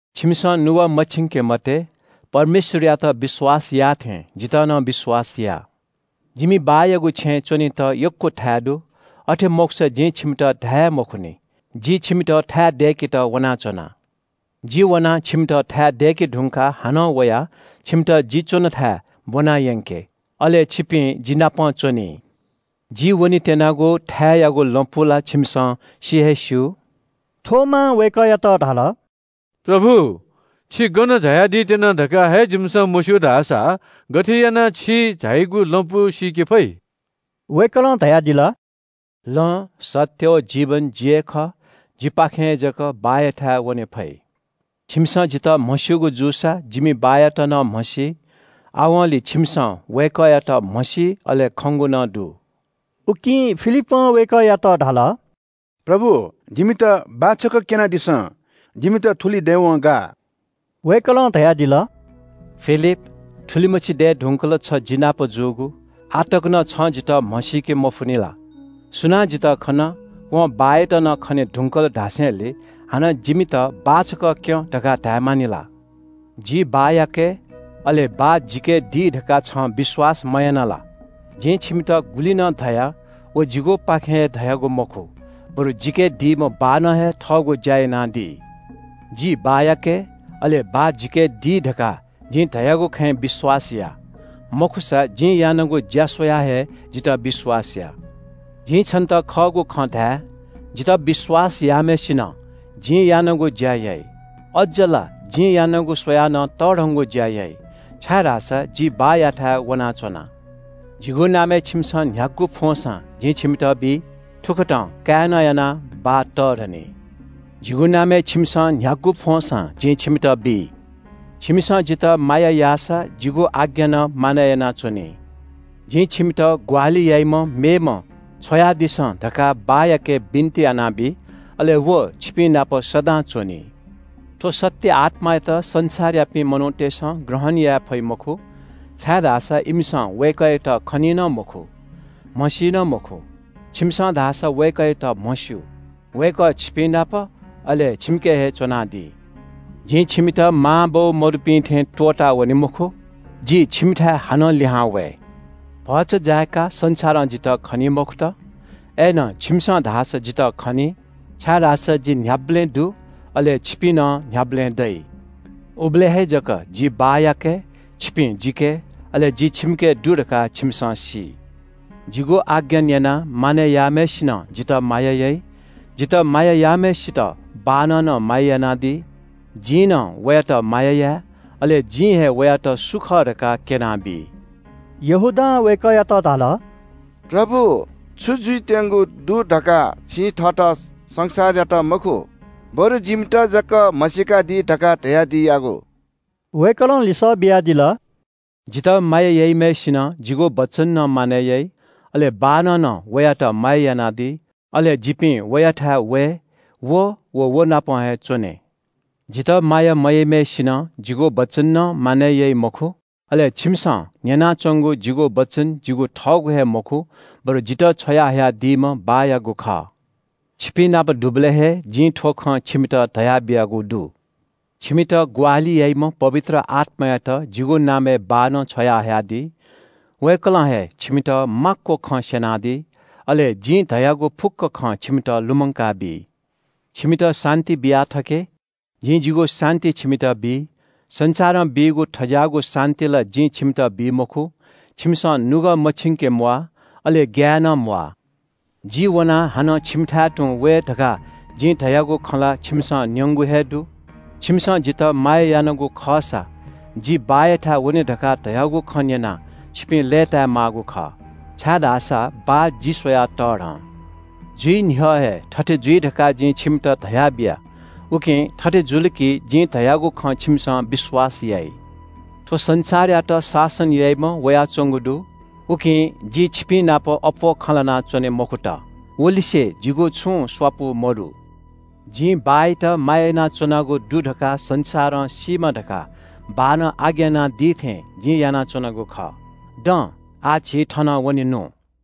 “छिमिसं नुगः मछिंके मते, परमेश्‍वरयात विश्‍वास याःथें जितः नं विश्‍वास या। जिमि बाःयागु छेँय् च्‍वनेत यक्‍व थाय् दु। अथे मखुसा जिं छिमित धाये हे मखुनि। जि छिमित थाय् दय्‌केत वनाच्‍वना। जि वनाः छिमित थाय् दय्‌के धुंकाः हानं वयाः छिमित जि च्‍वनेथाय् ब्‍वनायंके। अले छिपिं जिनापं च्‍वनी। जि वनेत्‍यनागु थाय्‌यागु लँपु ला छिमिसं सि हे स्‍यू।” थोमां वय्‌कःयात धाल – “प्रभु, छि गन झायादी त्‍यना धकाः हे जिमिसं मस्‍यू धाःसा गथे यानाः छि झाइगु लँपु सीके फइ?” वय्‌कलं धयादिल – “लँ, सत्‍य व जीवन जि हे खः। जिपाखें हे जक बाःयाथाय् वने फइ। छिमिसं जितः म्‍हस्‍यूगु जूसा जिमि बाःयात नं म्‍हसी। आवंलि छिमिसं वय्‌कःयात म्‍हसी अले खंगु नं दु।” उकिं फिलिपं वय्‌कःयात धाल – “प्रभु, जिमित बाः छकः क्‍यनादिसँ। जिमित थुलि दयेवं गाः।” वय्‌कलं धयादिल – “फिलिप, थुलिमछि दये धुंकल छ जि नाप जूगु, आः तक नं छं जितः म्‍हसीके मफुनि ला? सुनां जितः खन, वं बाःयात नं खने धुंकल धासेंलि हानं ‘जिमित बाः छकः क्‍यँ’ धकाः धायेमानि ला? जि बाःयाके, अले बाः जिके दी धकाः छं विश्‍वास मयाना ला? जिं छिमित गुलि नं धया, व जिगुपाखें हे धयागु मखु, बरु जिके दीम्‍ह बाःनं हे थःगु ज्‍या यानादी। जि बाःयाके, अले बाः जिके दी धकाः जिं धयागु खँय् विश्‍वास या। मखुसा जिं यानागु ज्‍या स्‍वयाः हे जितः विश्‍वास या। “जिं छन्‍त खःगु खँ धाये – जितः विश्‍वास याःम्‍हय्‌सिनं जिं यानागु ज्‍या याइ। अज्‍ज ला जिं यानागु स्‍वयाः नं तःधंगु ज्‍या याइ। छाय्‌धाःसा जि बाःयाथाय् वनाच्‍वना। जिगु नामय् छिमिसं न्‍ह्यागु फ्‍वंसां जिं छिमित बी। थुकथं काय्‌नं यानाः बाः तःधनी। जिगु नामय् छिमिसं न्‍ह्यागु फ्‍वंसां जिं छिमित बी।” “छिमिसं जितः माया याःसा जिगु आज्ञा नं मानय् यानाच्‍वनी। जिं छिमित ग्‍वाहालि याइम्‍ह मेम्‍ह छ्वयादिसँ धकाः बाःयाके बिन्‍ति यानाबी। अले व छिपिंनाप सदां च्‍वनी। थ्‍व सत्‍य आत्‍मायात संसारयापिं मनूतय्‌सं ग्रहण याये फइ मखु, छाय्‌धाःसा इमिसं वय्‌कःयात खनी नं मखु, म्‍हसी नं मखु। छिमिसं धाःसा वय्‌कःयात म्‍हस्‍यू। वय्‌कः छिपिंनाप, अले छिमिके हे च्‍वनादी।” “जिं छिमित मांबौ मदुपिं थें त्‍वःतावने मखु, जि छिमिथाय् हानं लिहां वये। भचा जाय्‌काः संसारं जितः खनी मखुत। अय्‌नं छिमिसं धाःसा जितः खनी, छाय्‌धाःसा जि न्‍ह्याबलें दु, अले छिपिं नं न्‍ह्याबलें दइ। उबलय् हे जक जि बाःयाके, छिपिं जिके, अले जि छिमिके दु धकाः छिमिसं सी। जिगु आज्ञा न्‍यनाः मानय् याःम्‍हय्‌सिनं जितः माया याइ। जितः माया याःम्‍हय्‌सित बाःनं नं माया यानादी। जिं नं वयात माया याये, अले जिं हे वयात सु खः धकाः क्‍यनाबी।” यहूदां (इस्‍करियोत मखु) वय्‌कःयात धाल – “प्रभु, छु जुइत्‍यंगु दु धकाः छिं थःत संसारयात मखु, बरु जिमित जक म्‍हसीकादी धकाः धयादियागु?” वय्‌कलं लिसः बियादिल – “जितः माया याइम्‍हय्‌सिनं जिगु वचन नं मानय् याइ। अले बाःनं नं वयात माया यानादी। अले जिपिं वयाथाय् वये अले व नाप हे च्‍वने। जितः माया मयाइम्‍हय्‌सिनं जिगु वचन नं मानय् याइ मखु। अले छिमिसं न्‍यनाच्‍वंगु जिगु वचन जिगु थःगु हे मखु, बरु जितः छ्वयाहयादीम्‍ह बाःयागु खः।” “छिपिंनाप दुबलय् हे जिं थ्‍व खँ छिमित धयाबियागु दु। छिमित ग्‍वाहालि याइम्‍ह पवित्र आत्‍मायात जिगु नामय् बाःनं छ्वयाहयादी। वय्‌कलं हे छिमित माक्‍व खँ स्‍यनादी। अले जिं धयागु फुक्‍क खँ छिमित लुमंकाबी। “छिमित शान्‍ति बिया थके। जिं जिगु शान्‍ति छिमित बी। संसारं बीगु थज्‍याःगु शान्‍ति ला जिं छिमित बी मखु। छिमिसं नुगः मछिंके म्‍वाः, अले ग्‍याये नं म्‍वाः। ‘जि वनाः हानं छिमिथाय् तुं वये’ धकाः जिं धयागु खँ ला छिमिसं न्‍यंगु हे दु। छिमिसं जितः माया यानागु खःसा जि बाःयाथाय् वने धकाः धयागु खँ न्‍यनाः, छिपिं लय्‌ताय् माःगु खः, छाय्‌धाःसा बाः जि स्‍वयाः तःधं। जुइ न्‍ह्यः हे थथे जुइ धकाः जिं छिमित धयाबिया, उकिं थथे जुल कि जिं धयागु खँ छिमिसं विश्‍वास याइ। “थ्‍व संसारयात शासन याइम्‍ह वयाच्‍वंगु दु, उकिं जि छिपिंनाप अप्‍वः खँ ल्‍हाना च्‍वने मखुत। वलिसे जिगु छुं स्‍वापु मदु। जिं बाःयात माया यानाच्‍वनागु दु धकाः संसारं सीमा धकाः बाःनं आज्ञा यानादी थें जिं यानाच्‍वनागु खः। दँ, आः झी थनं वनेनु।”